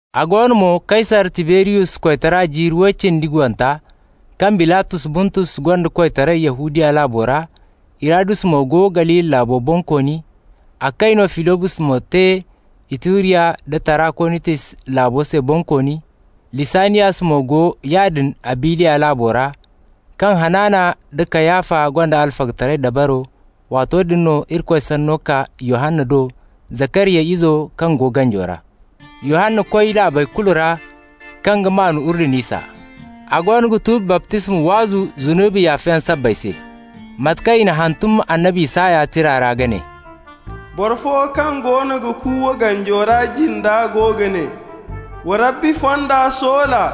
A go no mo, Kaysar Tiberiyus koytara jiiri way cindi guwanta, kaŋ Bilatos Buntus gonda koytaray Yahudiya laabo ra, Hirodus mo go Galili laabo bonkooni, a kayno Filibos mo te Ituriya nda Tarakonitis laabo se bonkooni, Lisaniyas mo go yaadin Abiliya laabo ra, kaŋ Hanana nda Kayafa gonda alfagataray dabaro, waato din no Irikoy sanno kaa Yohanna do, Zakariya izo kaŋ go ganjo ra. Yohanna koy laabey kulu ra kaŋ ga maan Urdun isa. A goono ga tuubi baptisma waazu zunubi yaafayaŋ sabbay se. Mate kaŋ i n'a hantum annabi Isaya tira ra ka ne: «Boro fo kaŋ goono ga kuuwa ganjo ra jinda go ga ne: ‹Wa Rabbi fonda soola,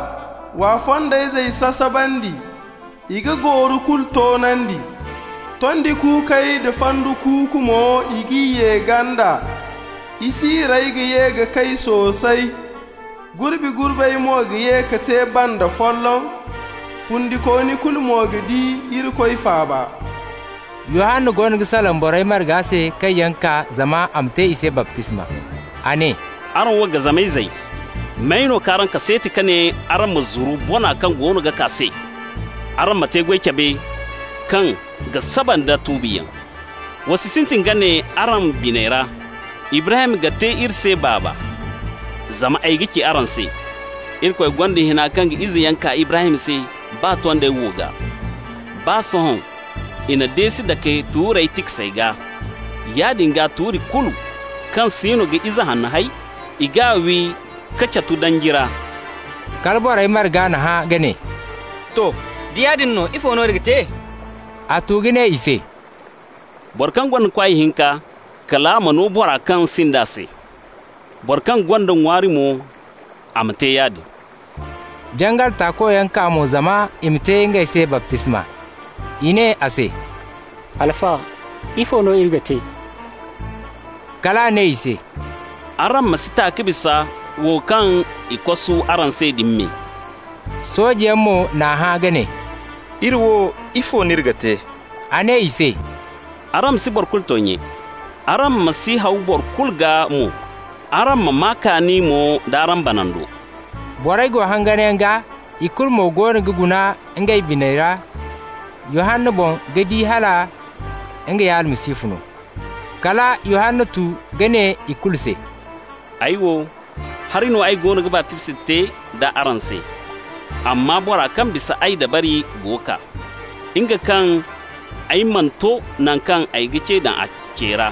w'a fondayzey sasabandi! I ga gooru kulu toonandi, tondi kuukey da fandu kulu mo, i g'i ye ganda. Isiirey ga ye ka kay soosay, gurbi-gurbey mo ga ye ka te banda folloŋ. Fundikooni kulu mo ga di Irikoy faaba.›» Yohanna goono ga salaŋ borey marga se kaŋ yaŋ kaa zama a ma te i se baptisma. A ne: «Araŋ wo gazama izey! May no k'araŋ kaseeti ka ne araŋ ma zuru bona kaŋ goono ga kaa se? Araŋ ma te-goy cabe kaŋ ga saba nda tuubiyaŋ. Wa si sintin ka ne araŋ biney ra: ‹Ibrahim ga te iri se baaba.› Zama ay ga ci araŋ se: Irikoy gonda hina kaŋ ga izeyaŋ kaa Ibrahim se baa tondey wo gaa. Baa sohõ i na deesi dake tuurey tiksey gaa. Yaadin gaa, tuuri kulu kaŋ siino ga ize hanno hay, i g'a wi k'a catu danji ra.» Kala borey marga n'a hã ka ne: «To, da yaadin no, ifo no iri ga te?» A tu ka ne i se: «Boro kaŋ gonda kwaay hinka, kal a ma no boro kaŋ sinda se. Boro kaŋ gonda ŋwaari mo, a ma te yaadin.» Jangal taakoyaŋ kaa mo zama i ma te ngey se baptisma. I ne a se: «Alfa, ifo no iri ga te?» Kal a ne i se: «Araŋ ma si ta ka bisa wo kaŋ i kosu araŋ se din me.» Soojeyaŋ mo n'a hã ka ne: «Iri wo, ifo no iri ga te?» A ne i se: «Araŋ ma si boro kulu toonye, araŋ ma si haawa boro kulu gaa mo. Araŋ ma maa kaani mo d'araŋ banando.» Borey go hanganyaŋ gaa, i kulu mo goono ga guna ngey biney ra Yohanna boŋ ka di hala nga ya Almasihu no. Kala Yohanna tu ka ne i kulu se: «Ay wo, hari no ay goono ga baptisma te d'a araŋ se, amma bora kaŋ ga bisa ay dabari go kaa, nga kaŋ ay mana to naŋ kaŋ ay ga ce daŋ a ce ra.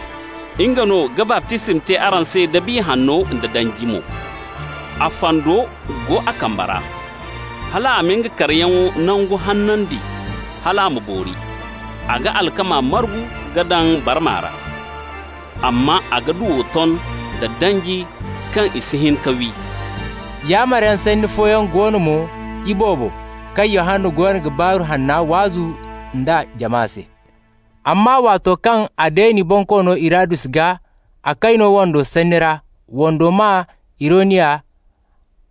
Nga no ga baptisma te araŋ se da Biya Hanno da danji mo. A fando go a kamba ra, hal a ma nga karayaŋ nango hanandi hal a ma boori. A ga alkama margu ka daŋ nga barma ra, amma a ga duwo ton da danji kaŋ i si hin ka wi.» Yaamaryaŋ sanni fooyaŋ go no mo iboobo kaŋ Yohanna goono ga Baaru Hanna waazu nd'a jama se. Amma waato kaŋ a deeni bonkoono Hirodus gaa, a kayno wando sanni ra (wando maa Hirodiya),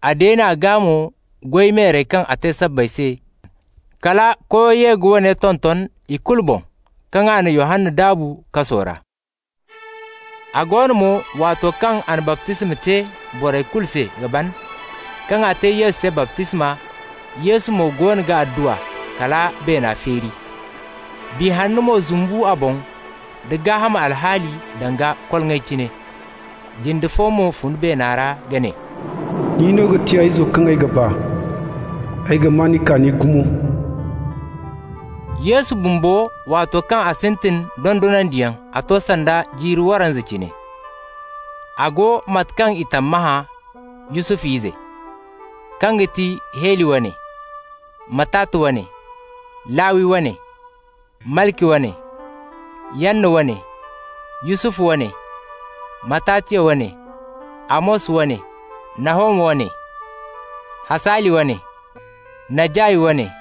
a deen'a gaa mo goy meerey kaŋ a te sabbay se, kala koyo ye ka woone tonton i kulu boŋ kaŋ a na Yohanna daabu kaso ra. A go no mo, waato kaŋ a na baptisma te borey kulu se ka ban, kaŋ a te Yesu se baptisma, Yesu mo goono ga adduwa, kala beena feeri. Biya Hanna mo zumbu a boŋ da gaaham alhaali danga koloŋay cine. Jinde fo mo fun beena ra ka ne: «Nin no ga ti ay Izo kaŋ ay ga ba. Ay ga maa ni kaani gumo.» Yesu bumbo, waato kaŋ a sintin dondonandiyaŋ, a to sanda jiiri waranza cine. A go (mate kaŋ i tammahã) Yusufu ize, kaŋ ga ti Heli wane, Matata wane, Lawi wane, Malki wane, Yanna wane, Yusufu wane, Matatiya wane, Amos wane, Nahoma wane, Hasali wane, Najay wane,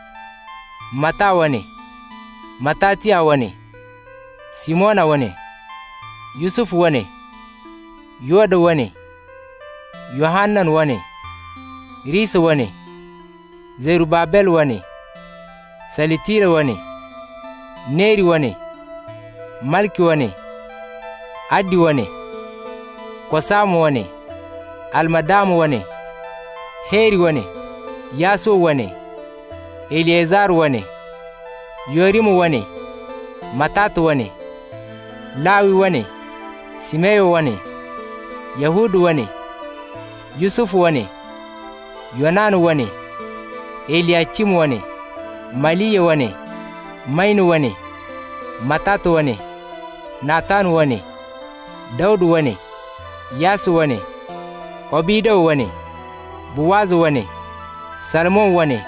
Mata wane, Matatiya wane, Simona wane, Yusufu wane, Yoda wane, Yohanan wane, Risa wane, Zerubabel wane, Salitila wane, Neri wane, Malki wane, Addi wane, Kosama wane, Almadama wane, Heri wane, Yasuwa wane, Eliyezar wane, Yorima wane, Matata wane, Lawi wane, Simeyon wane, Yahuda wane, Yusufu wane, Yonana wane, Eliyacim wane, Maliya wane, Mayna wane, Matata wane, Natan wane, Dawda wane, Yasse wane, Obida wane, Buwaza wane, Salmon wane,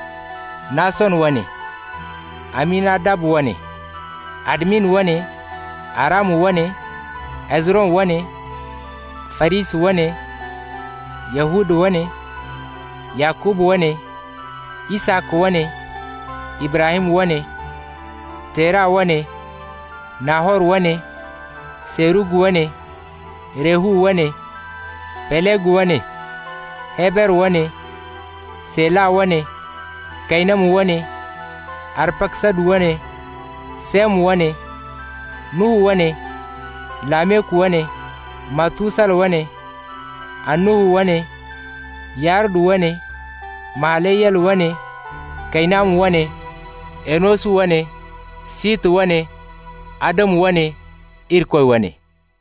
Nason wane, Aminadab wane, Admin wane, Arama wane, Hezron wane, Farisa wane, Yahuda wane, Yakuba wane, Isaka wane, Ibrahim wane, Tera wane, Nahor wane, Serug wane, Rehu wane, Peleg wane, Heber wane, Sela wane, Kaynama wane, Arpaksadu wane, Sem wane, Nuhu wane, Lameku wane, Matusala wane, Annuhu wane, Yaredu wane, Mahaleyel wane, Kaynama wane, Enosu wane, Sita wane, Adamu wane, Irikoy wane.